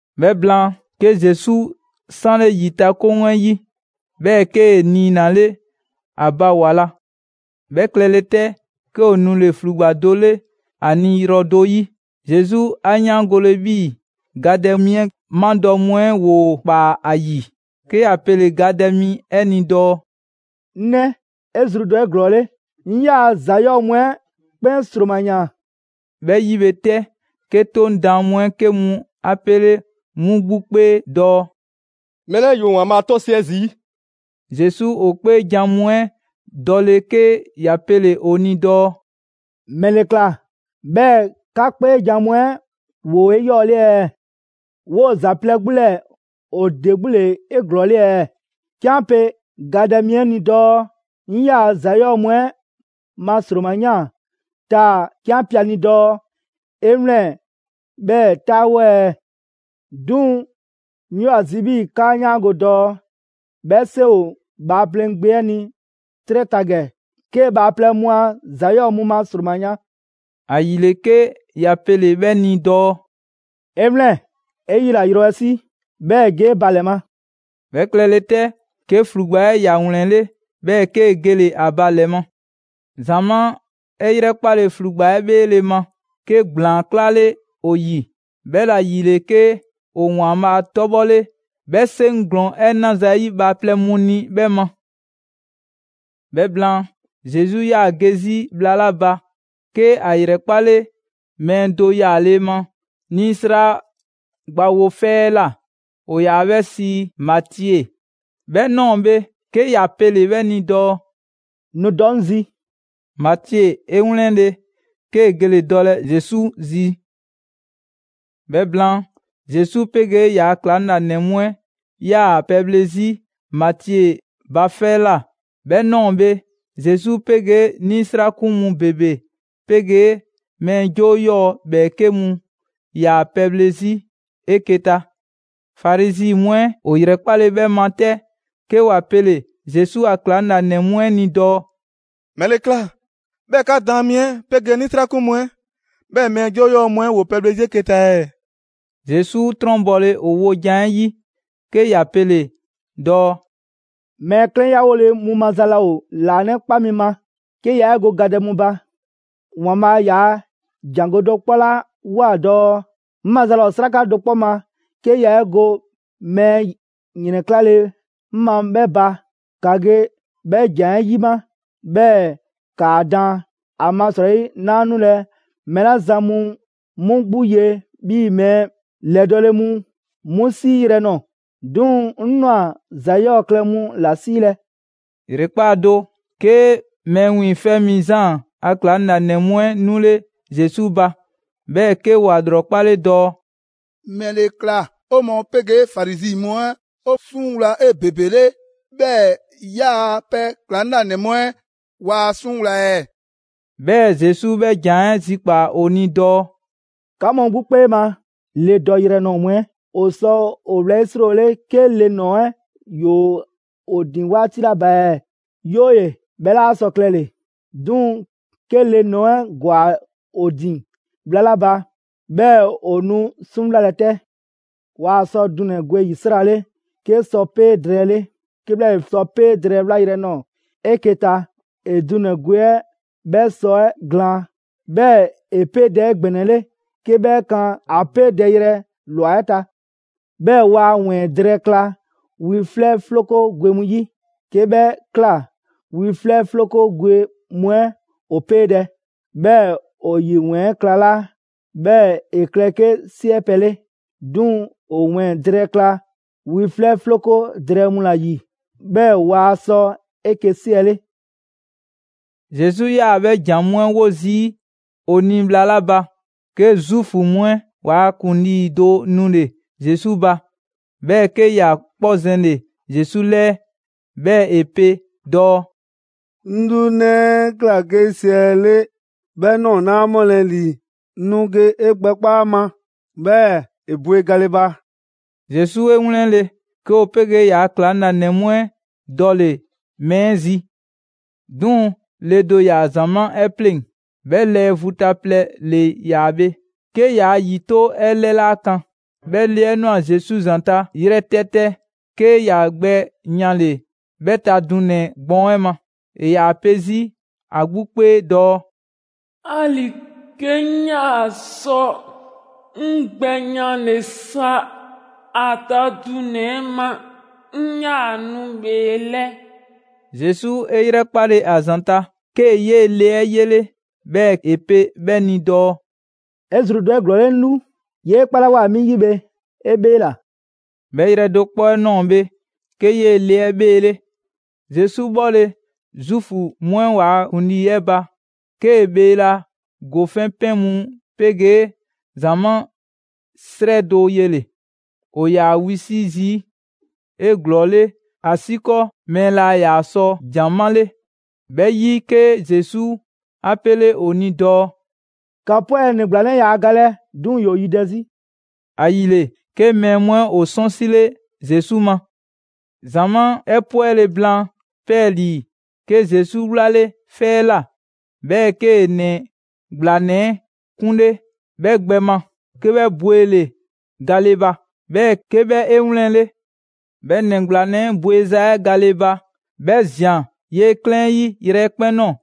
'Bhɛ blaan, 'ke Zesu 'sanle ‑yitakoŋ 'ɛ 'yi, 'bhɛɛ‑ 'kee‑ niinale ‑a ba ‑wa la. 'Bhɛ klɛle 'tɛ, 'ke ‑o nule‑ ‑flugba do 'le ‑a ni yrɔ do 'yi. Zesu 'a 'yaangole 'bhii‑ gadɛ mi 'ɛ madɔ mu 'ɛ ‑woo ‑kpaa ‑a ‑yi, 'ke ‑ya pele‑ gadɛ mi 'ɛ ni dɔɔ: «'Ŋ 'nɛ, 'e zru dɔ 'eglɔɔle, 'ŋ 'yaa‑ ‑za 'yɔɔ‑ mu 'ɛ 'kpɛn ‑sroma ‑yaan.» 'Bhɛ 'yi bhe 'tɛ, 'ke 'Toŋ daan mu 'ɛ 'ke mu 'a 'pele 'mu 'gbu 'kpee dɔɔ: «Mɛɛ 'lɛɛ‑ ‑yoo ‑Waanbhaa' 'tɔsiɛ zii'!» Zesu ‑o 'kpeejan‑ mu 'ɛ dɔle 'ke ‑ya pele‑ ‑o ni dɔɔ: «‑Mɛle ꞊kla 'bhɛɛ‑ 'ka 'kpeejan‑ mu 'ɛ ‑woo 'eyɔɔle ɛɛ? 'Woo‑ ‑za plɛ 'gbu 'lɛɛ‑ ‑o ‑de 'gbu ‑le 'eglɔɔle ɛɛ? 'Ke 'an pe gadɛ mi 'ɛ ni dɔɔ: ‹'Ŋ 'yaa‑ ‑za 'yɔɔ‑ mu 'ɛ ma ‑sroma ‑yaan› Taa‑ 'ke 'an pe ‑a ni dɔɔ: ‹'E 'wlɛn‑, 'bhɛɛ‑ 'taawo ɛɛ?› 'Duŋ‑ 'ŋ 'yoo‑ ‑a zi 'bhii‑ 'kaa 'yaango‑ dɔɔ 'bhɛ 'seŋ ‑o Bhaaplɛŋ Gbe 'ɛ ni 'trɛ ta ‑gɛ 'kee‑ bhaaplɛŋ mu a ‑za 'yɔɔ‑ mu ma ‑sroma yan.» ‑Ayile 'ke ‑ya pele‑ 'bhɛ ni dɔɔ: «'E 'wlɛn‑, 'e 'yila‑ yrɔ 'ɛ 'si, 'bhɛɛ‑ ge 'e ba ‑lɛ ma!» 'Bhɛ klɛle 'tɛ, 'ke ‑flugba 'ɛ ‑ya ‑wlɛnle', 'bhɛɛ‑ 'kee‑ gele‑ ‑a ba ‑lɛ ma. ‑Zamaa' 'ɛ 'yrɛkpale ‑flugba 'ɛ 'bheele‑ ma, 'ke ‑gblaan 'klale ‑o ‑yi, 'bhɛla‑ ‑yile, 'ke ‑o ‑Waanbhaa' 'tɔbhɔle 'bhɛ 'seŋ ‑glɔɔn 'ɛ 'naza‑ 'ɛ 'yi bhaaplɛŋ mu ni 'bhɛ ma. 'Bhɛ blaan, Zesu 'yaa‑ ge 'zi bhla 'la ba, 'ke ‑a ‑yrɛkpale mɛɛ do yaale ma 'nisra gbawo 'fɛ 'ɛ ꞊la: ‑O ‑yaa 'bhɛ sii Matie. 'Bhɛ 'nɔɔ‑ bhe, 'ke ‑ya pelɛ 'bhɛ ni dɔɔ: «Nu dɔ 'ŋ zi!» Matie 'e 'wlɛnle‑ 'kee‑ gele‑ dɔlɛ Zesu zi. 'Bhɛ blaan, Zesu 'pegee ‑yaa' ‑klaŋlanɛ mu 'ɛ 'yaa‑ pɛbhle 'zi Matie ba 'fɛ 'ɛ ꞊la. 'Bhɛ ꞊nɔɔ bhe, Zesu 'pegee 'nisrakun mu ‑bebe 'pegee mɛɛ 'joo 'yɔɔ‑ ‑bhɛɛke' mu ‑yaa pɛbhle 'zi 'eke‑ ta. Farizi mu 'ɛ ‑o ‑yrɛkpale 'bhɛ ma 'tɛ, 'ke ‑wa pele‑ Zesu a ‑klaŋlanɛ mu 'ɛ ni dɔɔ: «‑Mɛle ꞊kla 'bhɛɛ‑ 'ka daan mi 'ɛ 'pegee 'nisrakun mu 'ɛ, 'bhɛɛ‑ mɛɛ 'joo 'yɔɔ‑ mu 'ɛ ‑woo pɛbhle 'zi 'eke‑ ta ɛɛ?» Zesu 'trɔnbɔle ‑o wojan 'ɛ 'yi, 'ke ‑ya pele‑ dɔɔ: «Mɛɛ 'klɛnyawole mu maza laa ‑o ‑laanɛkpa mi ma; 'ke yaa 'e go gadɛ mu ba. ‑Waanbhaa' ‑yaa' ‑jangɔ' do 'kpɔ 'la ꞊woa dɔɔ: ‹'Ŋ maza laa ‑o 'sraka do 'kpɔ ma 'ke ya 'e go mɛɛ ‑yrɛnklale 'ŋ ma 'bhɛ ba;› ‑ka ge 'bhɛ ‑jan 'ɛ 'yima, 'bhɛɛ‑ ‑kaa daan. ‑Amasrɔyi 'naa 'nulɛ‑ mɛɛ 'la zan mu 'mu 'gbu ye 'bhii‑ mɛɛ ‑lɛdɔɔle mu 'mu 'siiyrɛ‑ nɔɔ‑, 'duŋ‑ 'ŋ ꞊nwa ‑za 'yɔɔ‑ klɛ mu ‑la 'siilɛ‑.» ‑Yrekpaa' do, 'ke Mɛɛ Wiiŋfɛ' Mi Zaan a ‑klaŋlanɛ mu 'ɛ 'nule Zesu ba, 'bhɛɛ‑ 'ke ‑wa ‑lrɔkpale dɔɔ: «‑Mɛle ꞊kla 'o mɔɔ 'pegee Farizi mu 'ɛ 'o 'suŋwla 'ebebele, 'bhɛɛ‑ 'yaa‑ pɛ ‑klaŋlanɛ mu 'ɛ waa 'suŋwla‑ ɛɛ?» 'Bhɛɛ‑, Zesu 'bhɛ ‑jan 'ɛ zikpaa‑ ‑o ni dɔɔ: «'Ka mu 'gbu 'kpee ma, le dɔyrɛ nɔɔ‑ mu 'ɛ ‑o sɔ ‑o wlɛyisriwole 'ke le ‑nɔɔ 'ɛ 'yoo ‑o ‑din 'waati 'la ba ɛɛ? 'Yooye‑ 'bhɛ 'la sɔ klɛle! 'Duŋ‑ 'ke le ‑nɔɔ 'ɛ ‑gwa ‑o ‑din bhla 'la ba, 'bhɛɛ‑ ‑o nu 'suŋwlalɛ 'tɛ.» «Waa sɔ dunɛ‑ gwe ‑yisrale 'ke sɔpee' drɛɛ 'le; 'kebhlaale, sɔpee' drɛɛ 'ɛ 'wlayrɛ‑ nɔɔ‑ 'eke‑ ta, ‑e dunɛ‑ gwe 'ɛ 'bhɛ sɔ 'ɛ glaan; 'bhɛɛ‑ ‑e 'peedɛ‑ 'egbɛnɛle 'ke 'bhɛ kan ‑a 'peedɛyrɛ ꞊lwa 'ɛ ta. 'Bhɛɛ‑ waa ‑wɛɛn drɛɛ kla wi 'flɛ 'floko gwe mu 'yi; 'ke 'bhɛ ꞊kla wi 'flɛ 'floko gwe mu 'ɛ ‑o 'peedɛ‑, 'bhɛɛ‑ ‑o ‑yi ‑wɛɛn 'ɛ klalaa', 'bhɛɛ‑ ‑e klɛ 'ke 'siɛ pɛ 'le. 'Duŋ‑ ‑o ‑wɛɛn drɛɛ kla wi 'flɛ 'floko drɛɛ mu ‑la ‑yi, 'bhɛɛ‑ waa sɔ 'eke‑ 'siɛle.» Zesu 'yaa‑ 'bhɛ ‑jan mu 'ɛ 'wo zii' ‑o ni bhla 'la ba, 'ke Zuufu mu 'ɛ ‑waa' ‑kuŋlii do nule‑ Zesu ba, 'bhɛɛ‑ 'ke ‑ya 'kpɔ zɛnle‑ Zesu 'lɛɛ. 'Bhɛɛ‑ ‑e pe dɔɔ: «'Ŋ 'lu 'nɛ 'ɛ ꞊kla 'ke 'siɛle, 'bhɛ ꞊nɔɔ 'laa ‑mɔlɛ' ‑li, nu ge 'e gbɛkpa' ‑a ma, 'bhɛɛ‑ ‑e bwe gale ba.» Zesu 'e 'wlɛnle‑, 'ke ‑o 'pegee ‑yaa' ‑klaŋlanɛ mu 'ɛ dɔle‑ mɛɛ 'ɛ zi. 'Duŋ‑, le do ‑yaa ‑zamaa' 'ɛ 'pleŋ‑, 'bhɛ lɛɛ vu ta plɛ ‑le yaa bhe, 'ke yaa ‑yito' 'ɛ 'lɛ 'laa kan. 'Bhɛ le 'ɛ ꞊nwa Zesu ‑zanta' yrɛtɛtɛ, 'ke ‑ya gbɛ yanle‑ 'bhɛ ta dunɛ‑ gbɔɔn 'ɛ ma. ‑E ‑yaa pe 'zi ‑a 'gbu 'kpee dɔɔ: «'Ali‑ 'ke 'ŋ 'yaa‑ sɔ 'ŋ gbɛ yanle sa ‑a ta dunɛ‑ 'ɛ ma, 'ŋ 'yaa‑ nu ‑bheelɛ'.» Zesu 'e 'yrɛkpale ‑a ‑zanta', 'kee‑ 'yee‑ le 'ɛ 'yele, 'bhɛɛ‑ ‑e pe 'bhɛ ni dɔɔ: «'E zru dɔ 'eglɔɔle, 'ŋ lu! 'Yee 'kpalawoa mi 'yi bhe 'e 'bheela‑.» 'Bhɛ yrɛ do 'kpɔ 'ɛ ꞊nɔɔ bhe, 'ke 'yee‑ le 'ɛ 'bheele. Zesu 'bhɔle‑ Zuufu mu 'ɛ ‑waa' ‑kuŋlii 'ɛ ba, 'kee‑ bheela ‑gofɛn' 'pɛn mu 'pegee ‑zamaa' 'srɛ do yele‑. ‑O ‑yaa wisi' zii' 'eglɔɔle ‑asiikɔɔ mɛɛ laa ‑yaa sɔ jan 'male. 'Bhɛ 'yi, 'ke Zesu 'a 'pele ‑o ni dɔɔ: «‑Ka 'pwɛ, ‑nɛ ‑gblanɛ 'ɛ yaa galɛ, 'duŋ‑ ‑yoo yidɛ 'zi.» ‑Ayile, 'ke mɛɛ mu 'ɛ ‑o 'sɔnsile Zesu ma. ‑Zamaa' 'ɛ 'pwɛle‑ blaan 'pɛɛlii‑, 'ke Zesu 'wlale 'fɛ 'ɛ ꞊la, 'bhɛɛ‑ 'kee‑ ‑nɛ ‑gblanɛ 'ɛ 'kunle 'bhɛ gbɛ ma, 'ke 'bhɛ bwele‑ gale ba, 'bhɛɛ‑ 'ke 'bhɛ 'e 'wlɛnle. 'Bhɛ ‑nɛ ‑gblanɛ 'ɛ bweza 'ɛ gale ba, 'bhɛ ꞊zian 'yee‑ 'klɛɛn 'ɛ 'yi yrɛkpɛn‑ ꞊nɔɔ.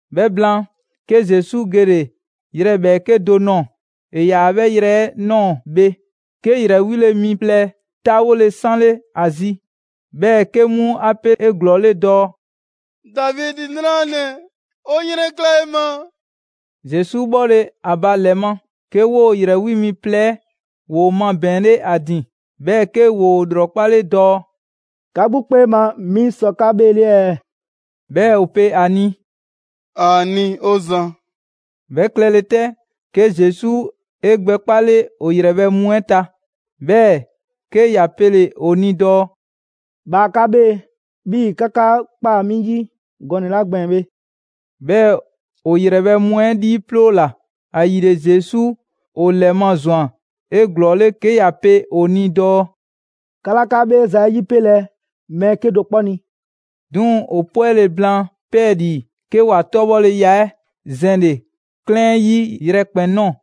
'Bhɛ blaan, 'ke Zesu gele‑ yrɛ ‑bhɛɛke' do ꞊nɔɔ. ‑E ‑yaa 'bhɛ yrɛ 'ɛ ꞊nɔɔ bhe, 'ke ‑yrɛ 'wile‑ mi plɛ 'taawole 'sanle ‑a zi, 'bhɛɛ‑ 'ke 'mu 'a pe 'eglɔɔle dɔɔ: «Davidi 'nranɛ‑, 'o 'yrɛnkla 'e ma!» Zesu 'bhɔle‑ ‑a ba ‑lɛ ma, 'ke 'woo‑ ‑yrɛ 'wi mi plɛ ‑woo mabɛɛnle 'a ‑din, 'bhɛɛ‑ 'ke ‑yoo ‑lrɔkpale dɔɔ: «'Ka 'gbu 'kpee ma 'mi sɔ 'ka 'bheele ɛɛ?» 'Bhɛɛ‑ ‑o pe ‑a ni: «‑Aani' 'o Zan.» 'Bhɛ klɛle 'tɛ, 'ke Zesu 'e gbɛ 'kpale ‑o ‑yrɛbhɛ' mu 'ɛ ta, 'bhɛɛ‑ 'ke ‑ya pele‑ ‑o ni dɔɔ: «Bhaa 'ka 'bhee‑ 'bhii‑ 'ka 'ka ꞊kpaa 'mi 'yi gɔnɛ‑ 'la gbɛɛn‑ bhe.» 'Bhɛɛ‑ ‑o ‑yrɛbhɛ' mu 'ɛ 'liiploola. ‑Ayile, Zesu ‑o ‑lɛmazwan 'eglɔɔle 'ke ‑ya pe ‑o ni dɔɔ: «'Ka 'laa 'ka 'bheeza‑ 'ɛ 'yipelɛ mɛɛ 'kedo‑ 'kpɔ ni.» 'Duŋ‑ ‑o 'pwɛle‑ blaan 'pɛɛlii‑, 'ke ‑wa 'tɔbhɔleya 'ɛ zɛnle‑ 'klɛɛn 'ɛ 'yi yrɛkpɛn‑ ꞊nɔɔ.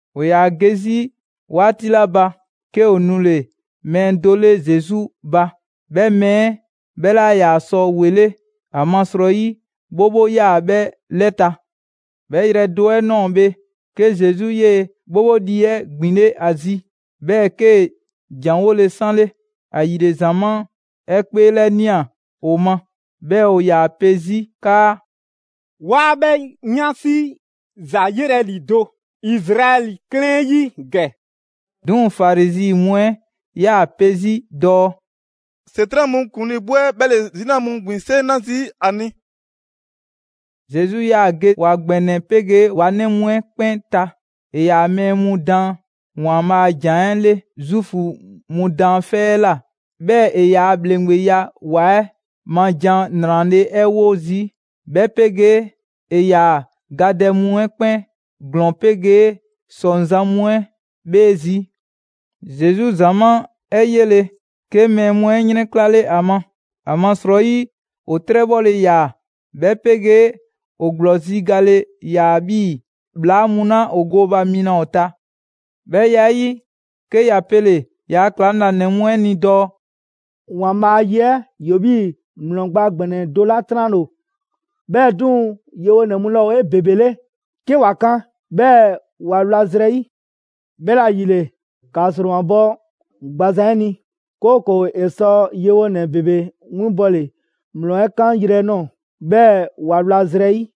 ‑O ‑yaa ge 'zi 'waati 'la ba, 'ke ‑o nule‑ mɛɛ do 'le Zesu ba. 'Bhɛ mɛɛ 'ɛ 'bhɛ 'laa ‑yaa sɔ ‑wele', ‑amasrɔyi 'bhobho 'yaa‑ 'bhɛ 'lɛ ta. 'Bhɛ yrɛ do 'ɛ ꞊nɔɔ bhe, 'ke Zesu 'yee‑ 'bhobho lii 'ɛ ‑gbinle' ‑a zi, 'bhɛɛ‑ 'kee‑ ‑janwole 'sanle. ‑Ayile, ‑zamaa' 'ɛ 'kpeelɛnia ‑o ma, 'bhɛɛ‑ ‑o ‑yaa 'pe 'zi 'kaa: «'Waa 'bhɛ 'yansi ‑za yelɛ ‑lido' Izraɛli 'klɛɛn 'ɛ 'yi ‑gɛ!» 'Duŋ‑ Farizi mu 'ɛ 'yaa‑ pe 'zi dɔɔ: «‑Setran' mu ‑kuŋlii 'gbu 'ɛ 'bhɛ ‑le 'zina mu ‑gbin 'seŋ 'na zii' ‑a ni!» Zesu 'yaa‑ ge ‑wa ‑gbɛnɛ 'pegee ‑wa 'nɛ mu 'ɛ 'kpɛn ta. ‑E ‑yaa mɛɛ mu daan ‑Waanbhaa' a ‑jan 'ɛ 'le Zuufu mu daanfɛ' mu 'ɛ ꞊la; 'bhɛɛ‑ ‑e ‑yaa ‑bhleŋgbeya ‑wa 'ɛ ma jan ‑nrale' 'ɛ 'wo zii', 'bhɛ 'pegee ‑e ‑yaa gadɛ mu 'ɛ 'kpɛn ‑glɔɔn 'pegee ‑sɔŋzan' mu 'ɛ 'bhee zii'. Zesu ‑zamaa' 'ɛ 'yele, 'ke mɛɛ mu 'ɛ 'yrɛnklale ‑a ma, ‑amasrɔyi ‑o 'trɛbhɔle ‑yaa, 'bhɛ 'pegee ‑o ‑gblɔzi' gale ‑yaa 'bhii‑ ‑bhlaa mu 'la ‑o gooba mi laa ‑o ta. 'Bhɛ ya 'ɛ 'yi, 'ke ‑ya pele‑ ‑yaa' ‑klaŋlanɛ mu 'ɛ ni dɔɔ: «‑Waanbhaa' a ye 'ɛ ‑yoo 'bhii‑ ‑mlɔ gba ‑gbɛnɛ do 'la 'tranle‑ ‑o, 'bhɛɛ‑ 'duŋ‑ yewonɛ mu laa ‑o 'ebebele 'ke ‑wa kan, 'bhɛɛ‑ ‑wa wla zrɛ 'yi. 'Bhɛla‑ ‑yile, ‑ka ‑sromabɔ gbazan 'ɛ ni, 'kooko‑ ‑e sɔ yewonɛ ‑bebe 'winbɔle ‑mlɔ 'ɛ 'kan yrɛ ꞊nɔɔ, 'bhɛɛ‑ ‑wa wla zrɛ 'yi.»